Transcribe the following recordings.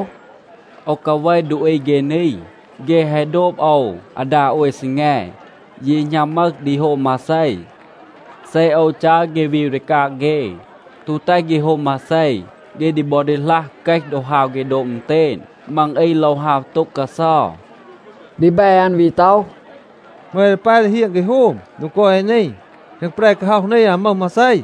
“โอว กาเว ดูอี เฆ นี. เฆ แฮะ โดบ โอว อาดา โอย ซีแง, ยี หณัม มึห ดี โฮม มาเซ. เซ โอว จัร เฆ วีว ดี กาง เฆ, ตู แตห เฆ โฮม มาเซ, เฆ ดี บอ ดีหลัห เกห ดอ ฮาว เฆ โดบ อึณเตณ. มัง อี โลว ฮาว โต็ง กาเซา.” ดีแบ อัน วี ต็อห, “เหมา เอ ดี ปาย ดี เฮียง เฆ โฮม โดง กอย เอ นี? แคง แปร กาฮ็อห นี อาว มึห มาเซ.”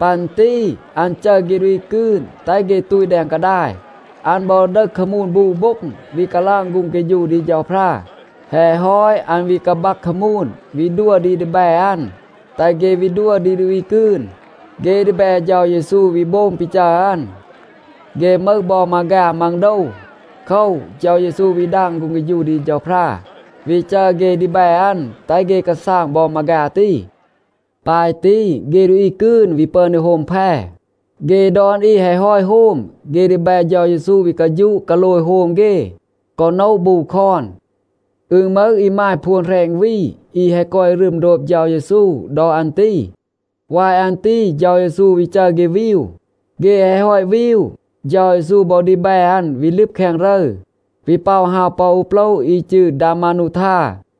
ปัน ตี อัน จัร เฆ ดูอี กืน แตห เฆ ตูต แดง กาดาย. อัน บอ ดึห คามูน บู โบ็ง, วี กาลาง ฆูง เฆฌู ดี เฌาพรา. แฮะ ฮอต, อัน วี กาบัก คามูน, วี ดัว ดี ดีแบ อัน, แตห เฆ วี ดัว ดี ดูอี กืน. เฆ ดีแบ เฌา เยซู วี โบง ปี จัร อัน. เฆ มึห บอ มาฆา มัง โดว. โคว, เฌา เยซู วี ดาง ฆูง เฆฌู ดี เฌาพรา, วี จัร เฆ ดีแบ อัน, แตห เฆ กาซาง บอ มาฆา ตี. ปาย ตี, เฆ ดูอี กืน วี ปึอน ดี โฮม แพ. เฆ ดอน อี แฮะ ฮอต โฮม, เฆ ดีแบ เฌา เยซู วี กาฌูะ กาโลย โฮม เฆ, กอ โนะ บู คอน. อึณ มึห อีมาย พวน แหรณ วี, อี แฮะ กอย รึม โดบ เฌา เยซู ดอ อัน ตี. วาย อัน ตี เฌา เยซู วี จัร เฆ วีว. เฆ แฮะ ฮอต วีว, เฌา เยซู บอ ดีแบ อัน วี ลึบ แคง รึร, วี ป็อะ ฮาว ปอ อู โปละ อี จืร ดามานูทา.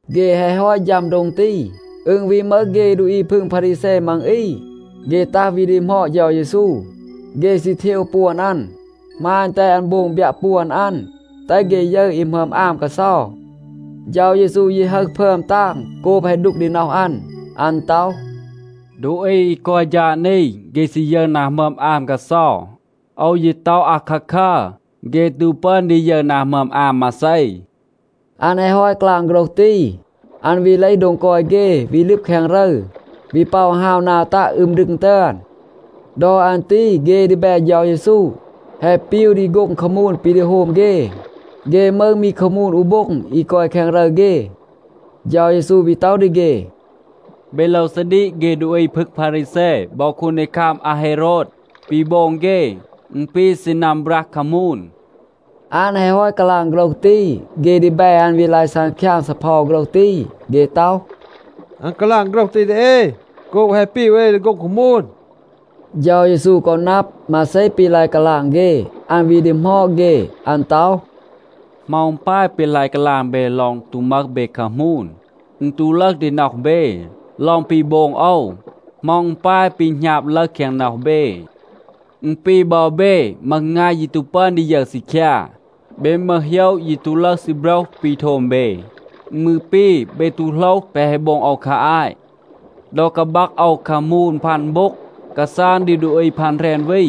เฆ แฮะ ฮอต ฌัม โดง ตี, อึณ วี มึห เฆ ดูอี พึง พารีแซ มัง อี, เฆ ตัห วี ดีหมอด เฌา เยซู. เฆ ซี เทว ปวน อัน, หมาณ, แตห อัน โบง บยัะ ปวน อัน, แตห เฆ ยึร อี หมึอม อาม กาเซา. เฌา เยซู ยี ฮึห พึอม ตาง โกบ แฮะ ดูก ดี น็อห อัน. อัน ต็อห, “ดูอี อี กอย ฌาด นี, เฆ ซี ยึร นา หมึอม อาม กาเซา. โอว ยี ต็อห อาคาคัร. เฆ ตู ปึอน ดี ยึร นา หมึอม อาม มาเซ.” อัน แฮะ ฮอต กาลาง โฆรห ตี, อัน วี เลห โดง กอย เฆ, วี ลึบ แคง รึร, วี ป็อะ ฮาว นา ตัะ อึม ดึง ตึอน. ดอ อัน ตี เฆ ดีแบ เฌา เยซู แฮะ ปีว ดี โฆ็ง คามูน ปี ดี โฮม เฆ. เฆ มึห มี คามูน อู โบ็ง อี กอย แคง รึร เฆ. เฌา เยซู วี ต็อห ดี เฆ, “เบ โลว ซาดีก เฆ ดูอี พึง พารีแซ บอ คูนดีคัม อาเฮโรด. ปี โบง เฆ, อึณ ปี ซีนัม บรัห คามูน.” อัน แฮะ ฮอต กาลาง โฆรห ตี, เฆ ดีแบ อัน วี ลาย ซังคยาง ซีเพา โฆรห ตี. เฆ ต็อห, “อัน กาลาง โฆรห ตี ดี เอ โกบ แฮะ ปีว เอ ดี โฆ็ง คามูน.” เฌา เยซู กอ นับ, มาเซ ปี ลาย กาลาง เฆ. อัน วี ดีหมอด เฆ. อัน ต็อห, “เหมา อึณ ปาย ปี ลาย กาลาง เบ ลอง ตู มึห เบ คามูน? อึณ ตู ลึห ดี น็อห เบ, ลอง ปี โบง โอว? เหมา อึณ ปาย ปี หณาบ ลึห แคง น็อห เบ? อึณ ปี บอ เบ มึห งาย ยี ตู ปึอน ดี ยึร ซีคยา. เบ มึห โหยะ ยี ตู ลึห ซีโบรห ปี โทม เบ. อึณ มืร ปี, เบ ตู โหลห แปะ แฮะ โบง โอว คา อาต. ดอ กาบัก โอว คามูน พัน โบ็ง, กาซาง ดี ดูอี พัน แหรณ วี,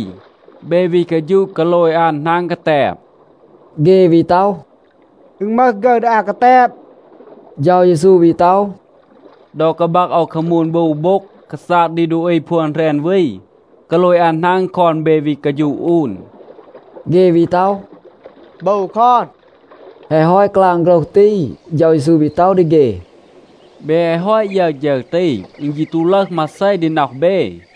เบ วี กาฌูะ กาโลย อัน หนาง กาแตบ?” เฆ วี ต็อห, “อึณ มึห ฆึร ดี อา กาแตบ.” เฌา เยซู วี ต็อห, “ดอ กาบัก โอว คามูน บู โบ็ง, กาซาง ดี ดูอี พวน แหรณ วี, กาโลย อัน หนาง คอน เบ วี กาฌูะ อูน?” เฆ วี ต็อห, “บู คอน.” แฮะ ฮอต กาลาง โฆรห ตี, เฌา เยซู วี ต็อห ดี เฆ, “เบ แฮะ ฮอต ยึร ฌึร ตี, อึณ ยี ตู ลึห มาเซ ดี น็อห เบ.”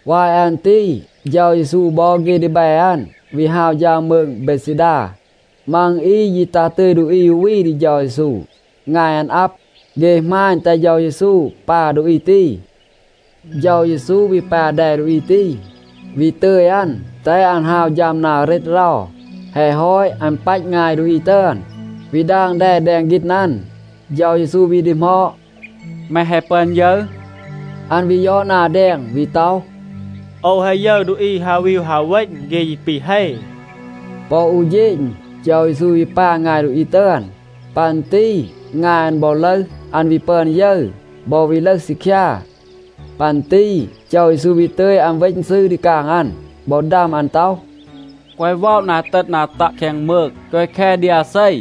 วาย อัน ตี เฌา เยซู บอ เฆ ดีแบ อัน วี ฮาว ฌัม มืง เบดซีดา. มัง อี ยี ตัห ตึย ดูอี อู วี ดี เฌา เยซู. งาย อัน อับ. เฆ หมาณ แตห เฌา เยซู ปา ดูอี ตี. เฌา เยซู วี ปา แด ดูอี ตี, วี ตึย อัน, แตห อัน ฮาว ฌัม นา เรต เรา. แฮะ ฮอต, อัน ปัต งาย ดูอี ตึอน, วี ดาง แด แดง ฆีณ อัน. เฌา เยซู วี ดีหมอด, “แม แฮะ ปึอน ยึร?” อัน วี ยอด นา แดง, วี ต็อห, “โอว แฮะ ยึร ดูอี ฮาว วีว ฮาว เวณ. เฆ ยี ปี เฮ.” ปอ อู เฌณ เฌา เยซู วี ปา งาย ดูอี ตึอน. ปัน ตี งาย อัน บอ ลึห, อัน วี ปึอน ยึร, บอ วี ลึห ซีคยา. ปัน ตี เฌา เยซู วี ตึย อัน เวณ ซืร ดี กาง อัน บอ ดัม อัน ต็อห, “แกวะ ว็อะ นา เตต นา ตัะ แคง มืง. แกวะ แค ดี อาเซ.”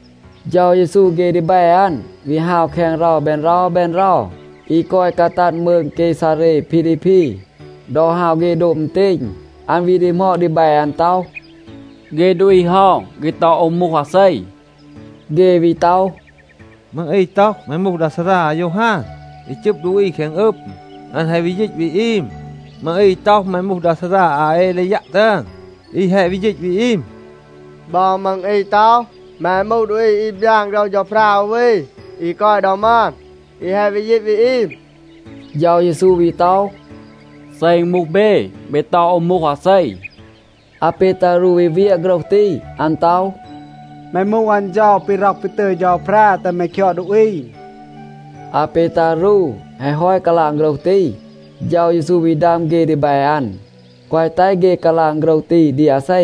เฌา เยซู เฆ ดีแบ อัน วี ฮาว แคง เรา แบน เรา แบน เรา อี กอย กาตัด มืง เกซาเร พีลีพี. ดอ ฮาว เฆ โดบ อึณเตณ, อัน วี ดีหมอด ดีแบ อัน ต็อห, “เฆ ดูอี เฮา, เฆ ต็อห โอว มูห อาเซ?” เฆ วี ต็อห, “มัง อี ต็อห, แม มูห ดา ซารา อายอฮาน อี จึบ ดูอี แคง อึม, อัน แฮะ วี ยีต วี อึม. มัง อี ต็อห, แม มูห ดา ซารา อาเอลียัะ ตึอน, อี แฮะ วี ยีต วี อีม. บอ มัง อี ต็อห, แม มูห ดูอี อี บยาน โฆรห เฌาพรา อู วี, อี กอย ดอ มึอน, อี แฮะ วี ยีต วี อีม.” เฌา เยซู วี ต็อห, “เซ อึณ มูห เบ, เบ ต็อห โอว มูห อาเซ?” อาเปตารู วี เวียะ โฆรห ตี. อัน ต็อห, “แม มูห อัน เฌา ปี ร็อห ปี ตึย เฌาพรา แตห แม คยอด ดูอี.” อาเปตารู แฮะ ฮอต กาลาง โฆรห ตี, เฌา เยซู วี ดัม เฆ ดีแบ อัน, แกวะ แตห เฆ กาลาง โฆรห ตี ดี อาเซ.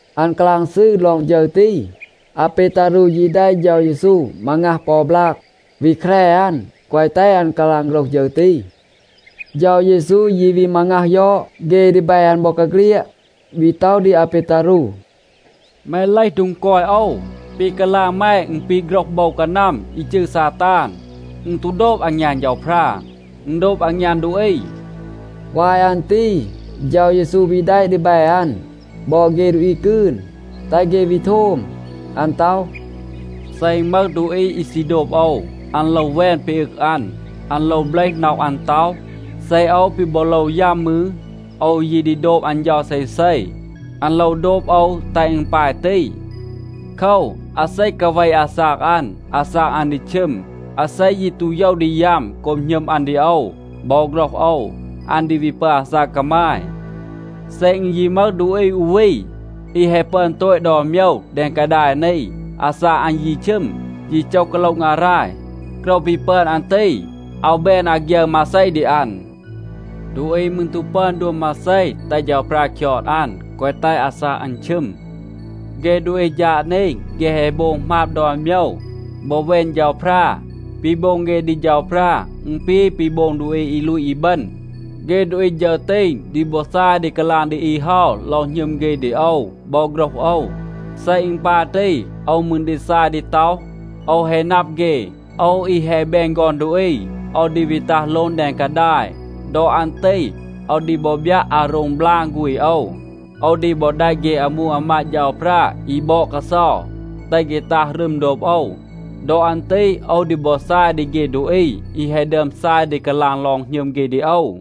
อัน กาลาง ซืร ลอง ฌึร ตี. อาเปตารู ยี แดะ เฌา เยซู มางัห ปอ บลาก, วี แคร อัน, แกวะ แตห อัน กาลาง โฆรห ฌึร ตี. เฌา เยซู ยี วี มางัห ยอด เฆ ดีแบ อัน บอกาเฆลียด, วี ต็อห ดี อาเปตารู, “แม เลห โดง กอย โอว. ปี กาลาง แม อึณ ปี โฆรห โบว กานัม อี จืร ซาตาน. อึณ ตู โดบ อางยาน เฌาพรา. อึณ โดบ อางยาน ดูอี.” วาย อัน ตี เฌา เยซู วี แดะ ดีแบ อัน บอ เฆ ดูอี กืน, แตห เฆ วี โทม. อัน ต็อห, “เซ อึณ มึห ดูอี อี ซี โดบ โอว, อัน โลว แวน ปี อึง อัน. อัน โลว เบลห น็อห อัน, ต็อห, ‘เซ โอว ปี บอ โลว ยัม มืร, โอว ยี ดี โดบ อัน เฌา เซเซ.’ อัน โลว โดบ โอว แตห อึณ ปาย ตี. โคว, อาเซ กาเว อาซาก อัน, อาซาก อัน ดี ชึม. อาเซ ยี ตู โยว ดี ยัม โกบ หณึม อัน ดี โอว บอ โฆรห โอว, อัน ดี วี ปึอน อาซาก กามาย. เซ อึณ ยี มึห ดูอี อู วี, อี แฮะ ปึอน โตต ดอน โมยว แดง กาดาย นี, อาซาก อัน ยี ชึม, ยี โจห กาโละ งาราย, โกรว ปี ปึอน อัน ตี อาว แบน อาฆยึร มาเซ ดี อัน. ดูอี มืร ตู ปึอน ดัว มาเซ, แตห เฌาพรา คยอด อัน, แกวะ แตห อาซาก อัน ชึม. เฆ ดูอี ฌาด นี, เฆ แฮะ โบง หมาบ ดอน โมยว บอ แวน เฌาพรา. ปี โบง เฆ ดี เฌาพรา, อึณ ปี ปี โบง ดูอี อี ลูต อีบึณ. เฆ ดูอี ฌึร ตี ดี บอ ซาย ดี กาลาง ดี อี เฮา ลอง หณึม เฆ ดี โอว บอ โฆรห โอว. เซ อึณ ปาย ตี, โอว มืร ดี ซาย ดี ต็อห, ‘โอว แฮะ นับ เฆ.’ โอว อี แฮะ แบน ฆอน ดูอี, โอว ดี วี ตัห โลง แดง กาดาย. ดอ อัน ตี โอว ดี บอ บยัะ อาโรง บลาง ฆูณ โอว. โอว ดี บอ แดะ เฆ อามู อามาด เฌาพรา อี บอด กาเซา, แตห เฆ ตัห รึม โดบ โอว. ดอ อัน ตี โอว ดี บอ ซาย ดี เฆ ดูอี อี แฮะ ดึอม ซาย ดี กาลาง ลอง หณึม เฆ ดี โอว.”